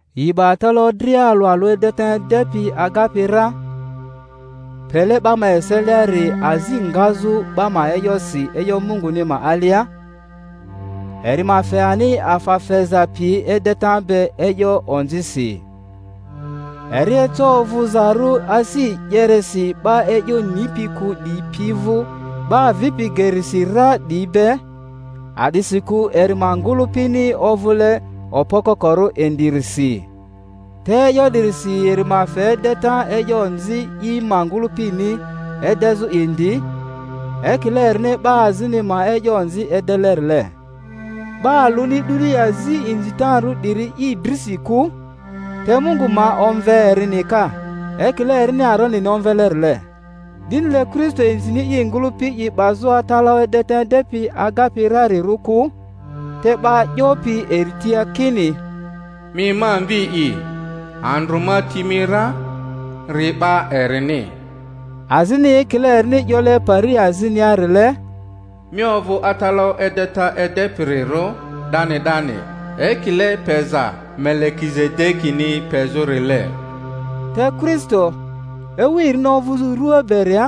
Yi 'ba atalaᴜ dria alᴜ alᴜ edeta edepi agapi ra, pele 'ba ma eseliari azi ngazᴜ 'ba ma e'yosi e'yo Munguni ma alia, eri ma fe ani afa feza piyi edeta be e'yo onzisi. Eri eco ovᴜzarᴜ asi e'yeresi 'ba e'yo nipi kᴜ 'diyi pi vᴜ 'ba avipi gerisi ra 'diyi be, a'disikᴜ eri ma ngᴜlᴜpini ovᴜle okpo kokorᴜ indirisi. Te e'yo 'dirisi eri ma fe edeta e'yo onzi i ma ngᴜlᴜpini edezᴜ indi, ekile erini 'ba azini ma e'yo onzi edelerile. 'Ba alᴜni 'duni azi inzitarᴜ 'diri i drisi kᴜ, te Mungu ma omve erini ka, ekile erini Aronini omvelerile. 'Dinile Kristo inzini i ngᴜlᴜpi i 'bazᴜ atalaᴜ edeta edepi agapi rarirᴜ kᴜ, te 'ba 'yopi eri tia kini, Mi ma Mvi'i, andrᴜ ma ti mi ra-ri 'ba erini; azini ekile erini 'yole pari azinia-rile, Mi ovᴜ atalaᴜ edeta edepirirᴜ 'dani 'dani ekile peza Melekizedekini pezᴜ-rile. Te Kristo, ewu erini ovᴜzᴜ rua beria,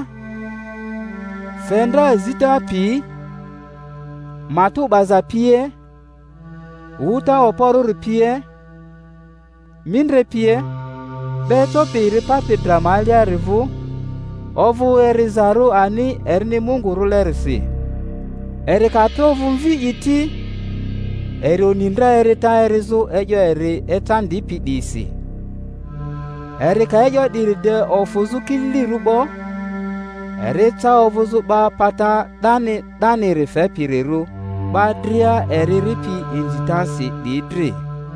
fe ndra zita pi, matᴜ 'baza pie, wᴜta okporᴜri pie, mindre pie, 'ba ecopi eri papi dra ma aliari vᴜ, ovᴜ erizarᴜ ani erini Mungu rᴜlerisi. Eri ka tro ovᴜ Mvi'i ti, eri oni ndra erita erizᴜ e'yo eri ecandipi 'diyisi; eri ka e'yo 'diri de ofᴜzᴜ kililirᴜ 'bo, eri eca ovᴜzᴜ 'ba pata 'dani 'daniri fepirirᴜ 'ba dria eri eripi inzitasi 'diyi dri;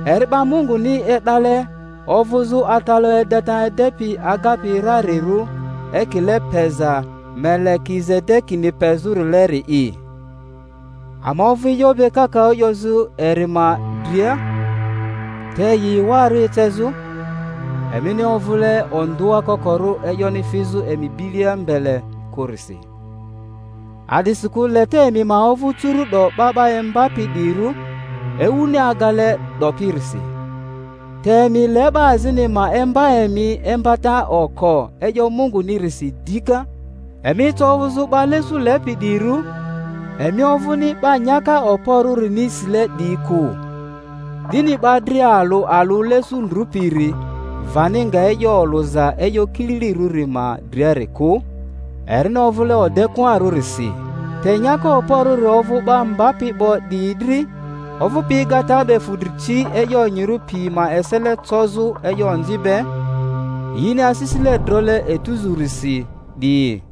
eri 'ba Munguni e'dale ovᴜzᴜ atalaᴜ edeta edepi agapi rarirᴜ ekile peza Melekizede-kini pezᴜrileri'i. Ama ovᴜ e'yo be kakaᴜ 'yozᴜ eri ma dria, te yi ewarᴜ ecezᴜ, emini ovᴜle ondᴜa kokorᴜ e'yoni fizᴜ emi bilia mbele kᴜrisi. A'disikᴜlete emi ma ovᴜ curu'do 'ba 'ba imbapi 'diyirᴜ, ewuni agale 'dopirisi, te emi le 'ba azini ma imba emi imbata oko e'yo Mungunirisi dika. Emi eca ovᴜzᴜ 'ba lesu lepi 'diyirᴜ, emi ovᴜni 'ba nyaka okporᴜrini sile 'diyi kᴜ; 'dini 'ba dria alᴜ alᴜ lesu ndrᴜpiri vani nga e'yo olᴜza e'yo kililirᴜri ma driari kᴜ, erini ovᴜle odekᴜarᴜrisi. Te nyaka okporᴜri ovᴜ 'ba mbapi 'bo 'diyi dri, ovᴜpi egata be fudri ci e'yo onyirᴜ pi ma esele cozᴜ e'yo onzi be, yini asisile drole etuzurisi 'diyi.